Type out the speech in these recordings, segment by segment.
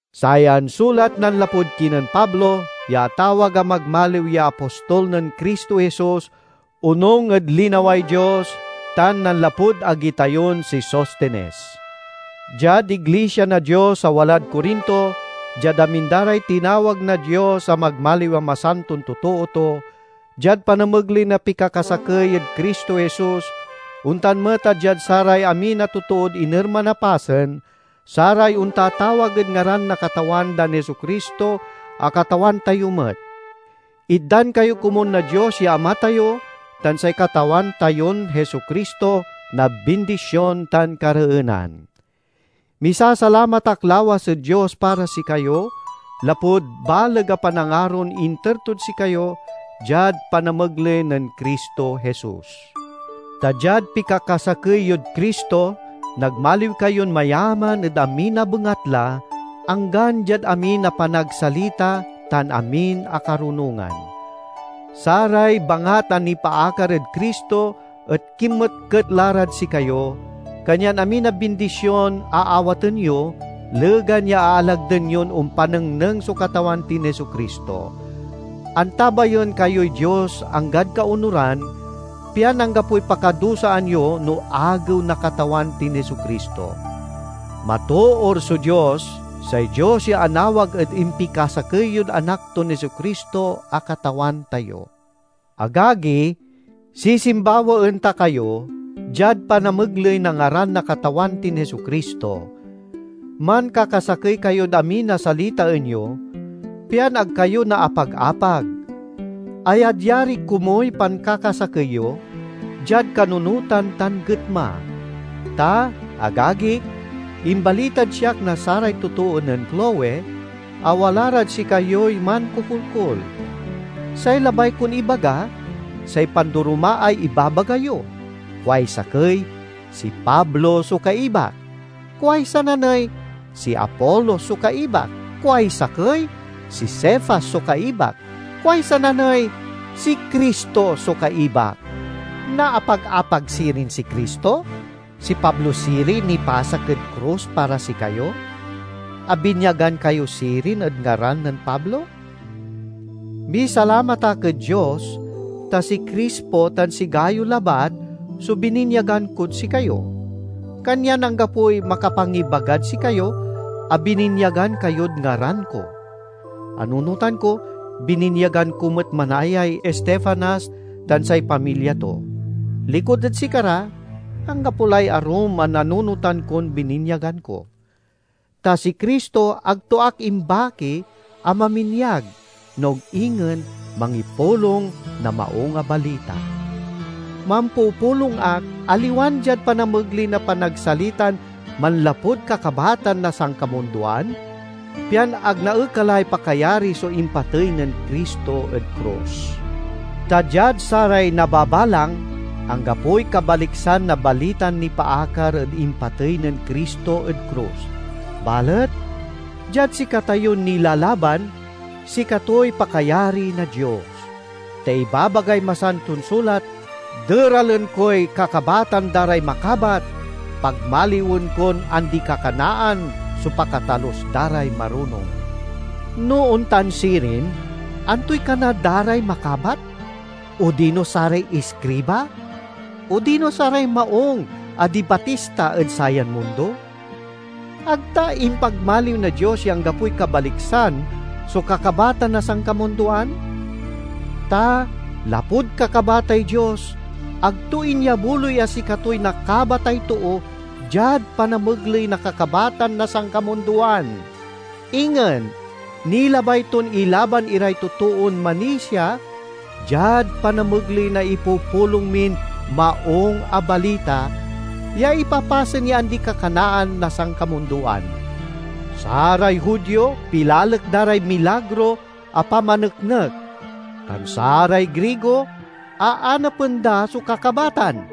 Sayan sulat nanlapud kinen Pablo, ya atawag a magmaliw ya apostol nen Cristo Jesus onung ed linaway Dios, tan nanlapud agi tayon si Sostenes— Diad iglisia na Dios a walad Corinto, diad amin da ray tinawag na Dios a magmaliw a masanton totoo to, diad panamegley na pikakasakey ed Cristo Jesus, ontan met a diad saray amin a totood inerman a pasen, saray ontatawag ed ngaran na Katawan dan Jesu-Cristo a Katawan tayo met: Itdan kayo komun na Dios ya Ama tayo tan say Katawan tayon Jesu-Cristo na bindision tan kareenan. Misasalamat ak lawas ed Dios para sikayo, lapud baleg a panangaron inter tod sikayo diad panamegley nen Cristo Jesus. Ta diad pikakasakey yod Cristo nagmaliw kayon mayaman ed amin a bengatla, anggan diad amin a panagsalita tan amin a karunongan. Saray bangat a nipaakar ed Cristo et kinmetket la rad sikayo, kanyan amin a bindision aawaten yo, legan ya aalagden yon ompanengneng so Katawan tin Jesu-Cristo. Antabayen kayoy Dios anggad kaonuran, pian anggapoy pakadusaan yo no Agew na Katawan tin Jesu-Cristo. Matoor so Dios, say Dios ya anawag ed impikasakey yod Anak ton Jesu-Cristo a Katawan tayo. Agagi, sisimbawaen ta kayo diad panamegley na ngaran na Katawan tin Jesu-Cristo: mankakasakey kayod amin a salitaen yo, pian ag kayo naapag-apag. Ayadyari komuy pankakasakey yo diad kanunotan tan getma. Ta, agagik, imbalitad siak na saray totoo nen Cloe a wala rad sikayoy mankokolkol. Say labay kon ibaga, say pandoromaay ibabaga yo. Kuay sakey, "Si Pablo so kaibak"; kuay sananey, "Si Apolos so kaibak"; kuay sakey, "Si Cefas so kaibak"; kuay sananey, "Si Cristo so kaibak." Naapag-apag sirin si Cristo? Si Pablo siriy nipasak ed krus para sikayo? Abinyagan kayo sirin ed ngaran nen Pablo? Misalamat ak ed Dios, ta si Crispo tan si Gayo labat so bininyagan kod sikayo. Kanyan anggapoy makapangibagad sikayo a bininyagan kayod ngaran ko. (Anunotan ko, bininyagan ko met manayay Estefanas tan say pamilya to. Likud ed sikara, anggapo lay arum a nanunotan kon bininyagan ko.) Ta si Cristo ag to ak imbaki a maminyag, no ag ingen mangipulong, na Maung a Balita. Mampupulong ak, aliwan diad panamegley na panagsalitan manlapud kakabatan na sankamundoan, pian ag naekalay pakayari so impatey nen Cristo ed krus. Ta diad saray nababalang, anggapoy kabaliksan na balitan nipaakar ed impatey nen Cristo ed krus; balet diad sikatayon nilalaban, sikatoy pakayari na Dios. Ta ibabagay Masanton Sulat, "Deralen koy kakabatan da ray makabat, pagmaliwen kon andi-kakanaan so pakatalus da ray marunong." No ontan sirin, antoy kana da ray makabat? Odino saray iskriba? Odino saray maung a dibatista ed sayan mundo? Ag ta impagmaliw na Dios ya anggapoy kabaliksan so kakabatan na sankamundoan? Ta lapud kakabatay Dios, ag to inyabuloy a sikatoy nakabatay too diad panamegley na kakabatan na sankamundoan. Ingen nilabay ton ilaban iray totoon manisia diad panamegley na ipupulong min Maung a Balita ya ipapasen ya andi-kakanaan na sankamundoan. Saray Judio pilalek da ray milagro a pamaneknek, tan saray Grigo aanapen da so kakabatan.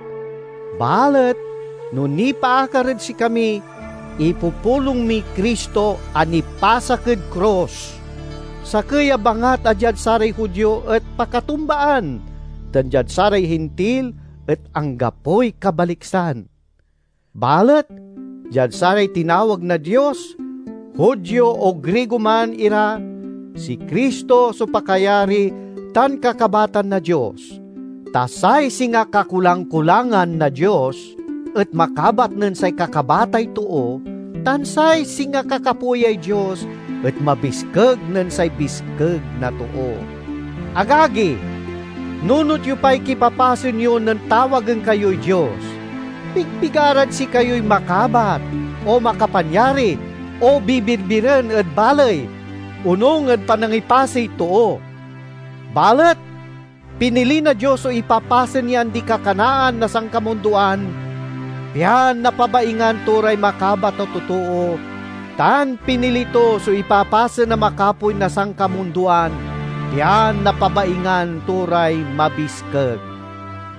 Balet no nipaakar ed sikami, ipupulong miy Cristo a nipasak ed krus, sakey a bangat a diad saray Judio et pakatumbaan tan diad saray Hintil et anggapoy kabaliksan. Balet diad saray tinawag na Dios, Judio o Grigo man ira, si Cristo so pakayari tan kakabatan na Dios. Ta say singa kakulang-kulangan na Dios et makabat nen say kakabatay too, tan say singa kakapoyay Dios et mabiskeg nen say biskeg na too. Agagi, nunot yo pay kipapasen yo nen tawagen kayoy Dios. Pigpigarad sikayoy makabat, o makapanyari, o bibirbiren ed baley, onung ed panangipasey too. Balet pinili na Dios so ipapasen ya andi-kakanaan na sankamundoan, pian napabaingan to ray makabat a totoo, tan pinili to so ipapasen a makapoy na sankamundoan, pian napabaingan to ray mabiskeg.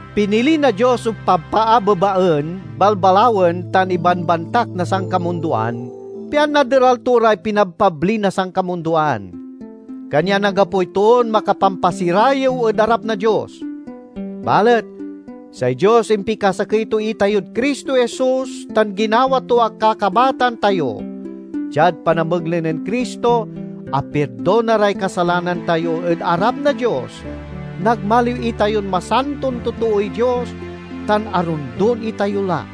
Pinili na Dios so pabpaabebaen, balbalawen, tan ibanbantak na sankamundoan, pian naderal to ray pinabpabli na sankamundoan. Kanyan anggapoy toon makapampasirayew ed arap na Dios. Balet say Dios impikasakey to itayod Cristo Jesus tan ginawa to a kakabatan tayo. Diad panamegley nen Cristo, apirdona ray kasalanan tayo ed arap na Dios, nagmaliw itayon masanton totooy Dios, tan arondon itayo la.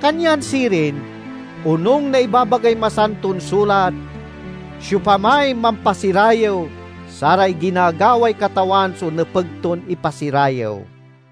Kanyan sirin, onung na ibabagay Masanton Sulat, "Siopamay mampasirayew, saray ginagaway Katawan so nepeg ton ipasirayew."